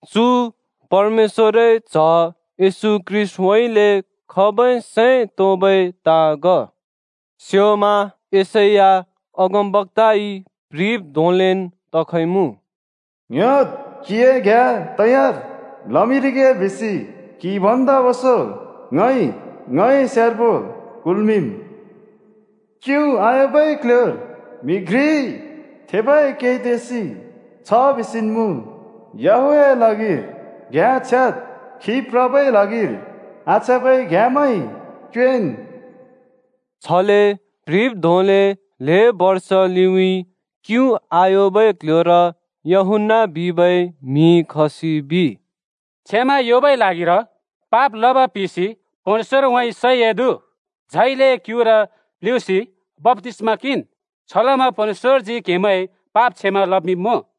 चु परमेश्‍वरए च्‍ह येशू ख्रीष्‍टउँइँले खबै सैं तोंबै ताँ ग। स्‍योंमा यशैया अगमबक्‍ताइ प्‍ह्रिब् धोंलेन् तखइमुँ: “ङ्ह्‍योद्, क्‍हिए घ्‍याँ तयार लमिंरिगे बिसि क्हि भन्दा ओंसों ङइ ङए स्यार्बो कुल्मिंम्। क्यु आयोंबै क्ल्ह्‍योर म्‍हि घ्रिइ थेबै कै तेसि छ बिसिन् मुँ, ‘याहवेहए ल्हागिर घ्‍याँ छ्याद्! खी प्रबै ल्हागिर आछ्याँबै घ्याँमैं क्योंएँन्!’” छले प्‍ह्रिब् धोंले ल्‍हें बर्ष लिउँइँ क्यु आयोंबै क्ल्ह्‍योर यूहन्‍ना बिबै म्हि खसि बिइ, “क्षमा योंबै ल्हागिर पाप लब पिसि परमेश्‍वरउँइँ सैं एदु, झाइले क्‍युर प्‍ल्हुँसि बप्‍तिस्‍मा किंन्। छलमा परमेश्‍वरजी क्‍हेमैंए पाप क्षमा लमिंब्मुँ।”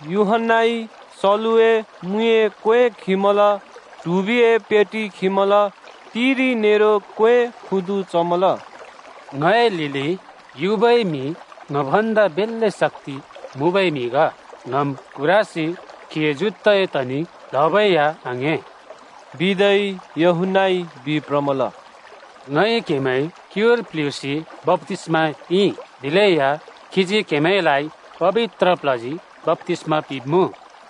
यूहन्‍नाइ सलुए मुइए क्‍वें खिमल, ट्हुबिए पेटि खिमल, तिरि नेरो क्‍वे खुदु चमल। “ङए लिलि युबै म्‍हि ङ भन्दा बेल्‍ले शक्‍ति मुँबै म्हि ग। ङम् कुरासि खीए जुत्ताए तनि प्‍ल्हबै या आङ्‍हें बिदै यूहन्‍नाइ बिप्रमल। ङइ क्‍हेमैं क्‍युर प्‍ल्हुँसि बप्‍तिस्‍मा पिंइ, दिलेया खीजी क्‍हेमैंलाइ पबित्र प्ल्हजी बप्‍तिस्‍मा पिंब्‍मुँ।”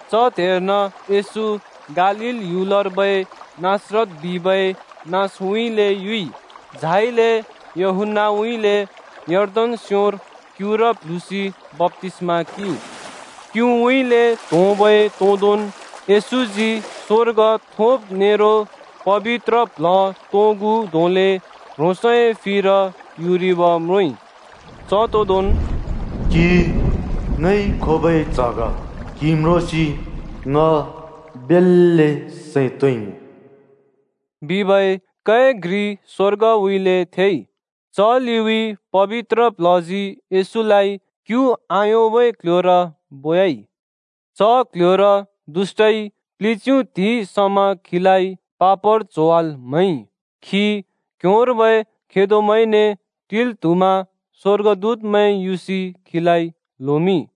च त्हेर्न येशू गालील ह्‍युलर्बै नासरत बिबै नाँसउँइँले युइ, झाइले यूहन्‍नाउँइँले यर्दन स्‍योंर क्युर प्‍ल्हुँसि बप्‍तिस्‍मा किंइ। क्‍युउँइँले त्‍होंबै तोदोंन् येशूजी स्वर्ग थोंब् नेरो पबित्र प्ल्ह तोंगु धोंले ह्रोंसए फिर युरिब म्रोंइ। च तोदोंन् “क्हि ङइ खोबै च्ह ग, क्‍हि म्रोंसि ङ बेल्‍ले सैं तोंइमुँ!” बिबै कै घ्रि स्वर्गउँइँले थेइ। च लिउँइँ पबित्र प्ल्हजी येशूलाइ क्यु आयोंबै क्ल्ह्‍योर बोयाइ। च क्‍ल्‍ह्‍योर दुष्‍टइ प्लिच्यु त्हिंइ समा खीलाइ पापर च्होवाल् म्हैइ। खी क्ह्‍योंर्बै खेदोमैंने टिल् त्हुमा स्‍वर्गदूतमैं युसि खीलाइ ल्होमिंइ।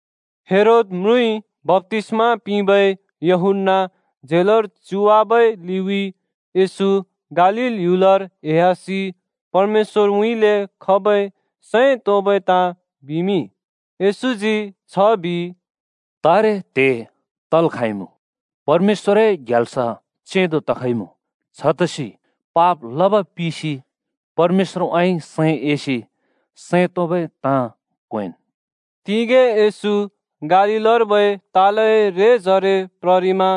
हेरोद म्रुँइ बप्‍तिस्‍मा पिंबै यूहन्‍ना झेलर च्युवाबै लिउँइँ येशू गालील ह्‍युलर एह्‍यासि परमेश्‍वरउँइँले खबै सैं तोंबै ताँ बिमिंइ। येशूजी छ बिइ, “तारे त्हे तल् खाँइमुँ, परमेश्‍वरए ग्याल्स चेंदो तखइमुँ। छतसि पाप लब पिसि परमेश्‍वरउँइँ सैं एसि सैं तोंबै ताँ क्वेंन्।” तिगें येशू गालीलर्बै तालए रेजरे प्ररिमा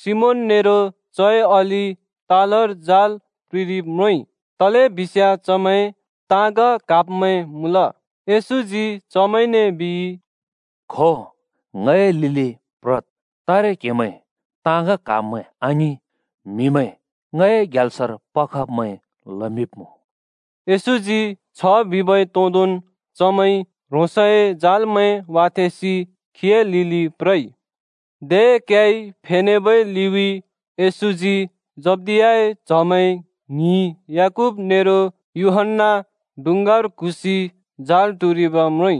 सिमोन नेरो चए अलि तालर जाल प्रिंरिब म्रोंइ। तलेबिस्याँ चमैं ताँग क्हाब्मैं मुँल। येशूजी चमैंने बिइ, “खो, ङए लिलि प्रद्। तारे क्‍हेमैं ताँग क्हाब्मैं आङिं, म्‍हिमैं ङए ग्ल्यासर पखब्मैं लमिंब्‍मुँ।” येशूजी छ बिबै तोंदोंन् चमैंइ ह्रोंसए जालमैं वाथेंसि खीए लिलि प्रइ। दे क्‍याइ फेनेबै लिउँइँ येशूजी जब्दियाए च्‍हमैं ङ्हिं याकूब नेरो यूहन्‍ना डुँङ्गार क्हुँसि जाल टुरिब म्रोंइ।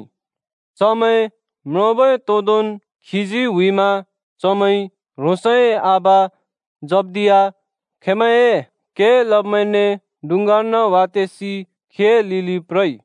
चमैं म्रोंबै तोंदोंन् खीजी हुइमा चमैंइ ह्रोंसए आबा जब्दिया खेंमैंए के लब्मैंने डुँङ्गार्न वाथेंसि खीए लिलि प्रइ।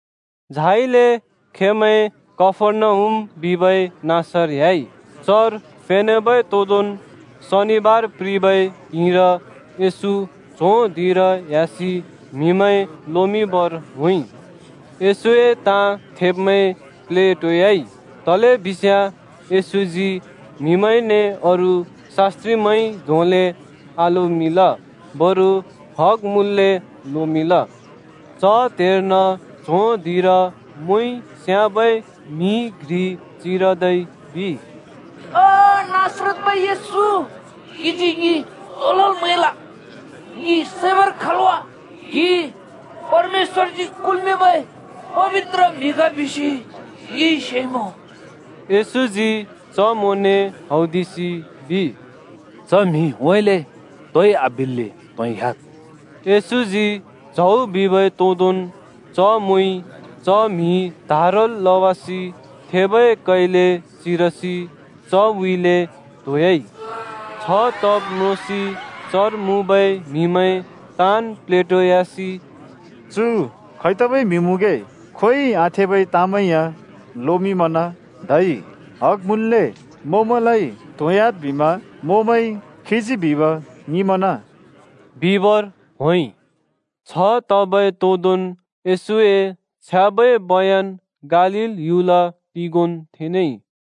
झाइले खेंमैं कफर्नहुम बिबै नाँसर ह्‍याइ। चर फेनेबै तोदोंन् शनिबार प्रिबै त्हिंइर येशू च्हों धिंर ह्‍यासि म्हिमैं लोमिंबर होंइ। येशूए ताँ थेब्‍मैं प्लेटोयाइ तलेबिस्याँ येशूजी म्हिमैंने अरू शास्‍त्रिमैंइ धोंले आलोमिंल, बरु हग मुँल्‍ले लोमिंल। च त्हेर्न च्हों धिंर मोंइ स्‍याबै म्‍हि घ्रिइ चिरदै बिइ, “ओ नासरतर्बै येशू, क्‍हिजी ङि तो लल् म्‍हैल? ङि सैबर खल् वा? क्‍हि परमेश्‍वरजी कुल्‍मिंबै पबित्र म्‍हि ग बिसि ङिइ सेइमुँ।” येशूजी च मोंने हौदिसि बिइ, “च म्‍हिउँइँले तोइ आबिल्‍ले त्‍होंह्‍याद्!” येशूजी च्हौ बिबै तोंदोंन् च मोंइ च म्‍हि त्हारल् लवासि थेबै कैले चिरसि चउँइँले त्‍होंह्‍याइ। छ तब् म्रोंसि चर मुँबै म्‍हिमैं ताँन् प्लेटोयासि “चु खै तबै म्हि मुँगे? खोंयोंइ आथेबै ताँमैं या लोमिंमना! धै हग मुँल्‍ले मोंमैंलाइ त्होंह्‍याद् बिमा मोंमैंइ खीजी बिब ङिंमना बिबर होंइ।” छ तबै तोंदोंन् येशूए छ्याँबै बयन गालील ह्‍युल तिगोंन् थेनेइ।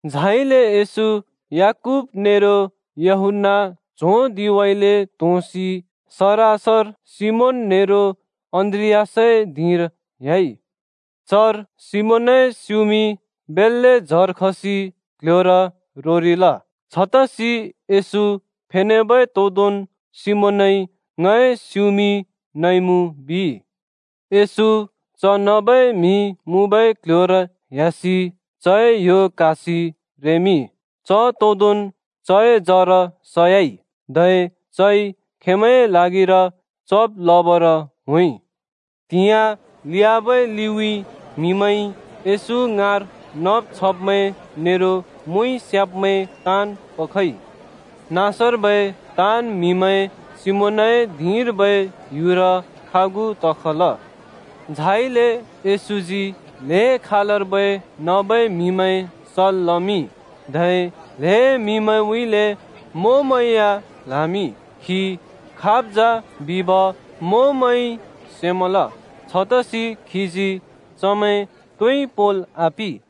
झाइले येशू, याकूब नेरो यूहन्‍ना च्हों धिंउँइँले त्‍होंसि सरसर सिमोन नेरो अन्‍द्रियासए धिंर ह्‍याइ। चर सिमोनए स्‍युमि बेल्‍ले जर खसि क्‍ल्‍ह्‍योर रोरिल। छतसि येशू फेनेबै तोंदोंन् सिमोनइ ङए स्युमि नइमुँ बिइ। येशू च नबै म्हि मुँबै क्‍ल्‍ह्‍योर ह्‍यासि चए यो क्‍हासि रेमिंइ। च तोदोंन् चए जर सयाइ। धै चइ खेंमैंए ल्हागिर चब् लबर होंइ। त्हिंयाँ लियाबै लिउँइँ म्हिमैंइ येशू ङाँर नब् छब्मैं नेरो मोंइ स्‍याब्मैं ताँन् पखइ। नाँसर्बै ताँन् म्‍हिमैं सिमोनए धिंर्बै ह्‍युर खागु तखल। झाइले येशूजी ल्हें खालर्बै नबै म्‍हिमैं सल् लमिंइ, धै ल्‍हें म्हिमैंउँइँले मोंमैं या ल्‍हामिंइ। खी खाब् जा बिब मोंमैंइ सेमल, छतसि खीजी चमैं तोइ पोंल आपिं।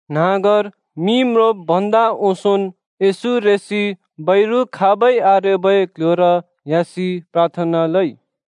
न्‍हाँगर मि म्रोंब् भन्दा ओंसोंन् येशू रेसि बैरु खाबै आरेबै क्‍ल्‍ह्‍योर ह्‍यासि प्राथना लइ।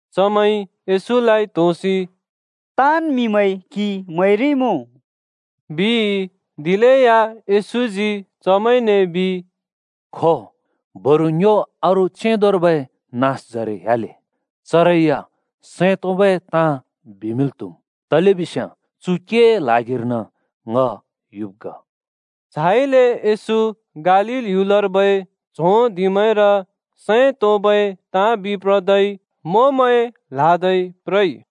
चमैंइ येशूलाइ त्होसि “ताँन् म्हिमैंइ क्‍हि म्‍हैरिइमुँ,” बिइ। दिलेया येशूजी चमैंने बिइ, “खो, बरु ङ्यो अरू चेंदोर्बै नाँसजरे ह्‍याले, चरै या सैं तोंबै ताँ बिमिंल् त्हुम्। तलेबिस्याँ चु केए ल्हागिर्न ङ युब् ग।” झाइले येशू गालील ह्‍युलर्बै च्हों धिंमैंर सैं तोंबै ताँ बिप्रदै मोंमैं ल्‍हादै प्रइ।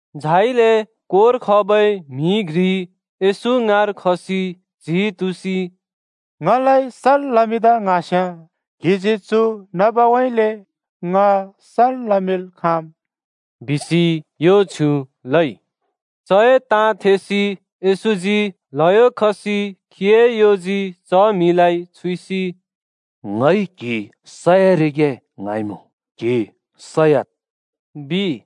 झाइले कोर खबै म्‍हि घ्रि येशू ङाँर खसि च्‍हि तुँसि “ङलाइ सल् लमिंदा ङ्हाँस्याँ क्‍हिजी चु नबउँइँले ङ सल् लमिंल् खाँम् बिसि यो छ्युँ लइ।” चए ताँ थेसि येशूजी ल्‍हयो खसि खीए योजी च म्हिलाइ छुइसि “ङइ क्हि सयारिगे ङ्हाँइमुँ क्हि सयाद्,” बिइ।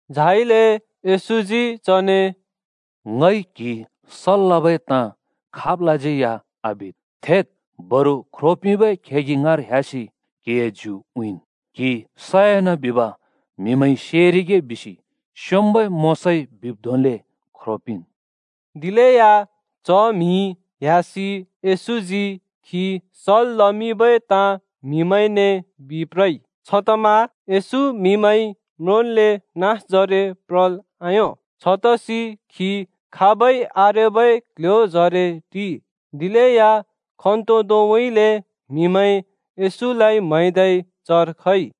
झाइले येशूजी चने “ङइ क्हि सल् लबै ताँ खाबलाज्यै या आबिद् बिसि कुलइ। थेद्, बरु ख्रो पिंबै खेगि ङाँर ह्‍यासि क्‍हिए ज्यु उँइँन्। क्हि सयान बिब म्हिमैंइ सेरिगे बिसि स्‍योंम्‍बै मोशाइ बिब् धोंले ख्रो पिंन्।” दिलेया च म्‍हि ह्‍यासि येशूजी खी सल् लमिंबै ताँ म्हिमैंने बिप्रइ। छतमा येशू म्हिमैंइ म्रोंन्ले नाँसजरे प्रल् आयों, छतसि खी खाबै आरेबै क्ल्ह्‍योजरे टिइ। दिलेया खन्तोदोंउँइँले म्‍हिमैं येशूलाइ म्‍हैदै चर खइ।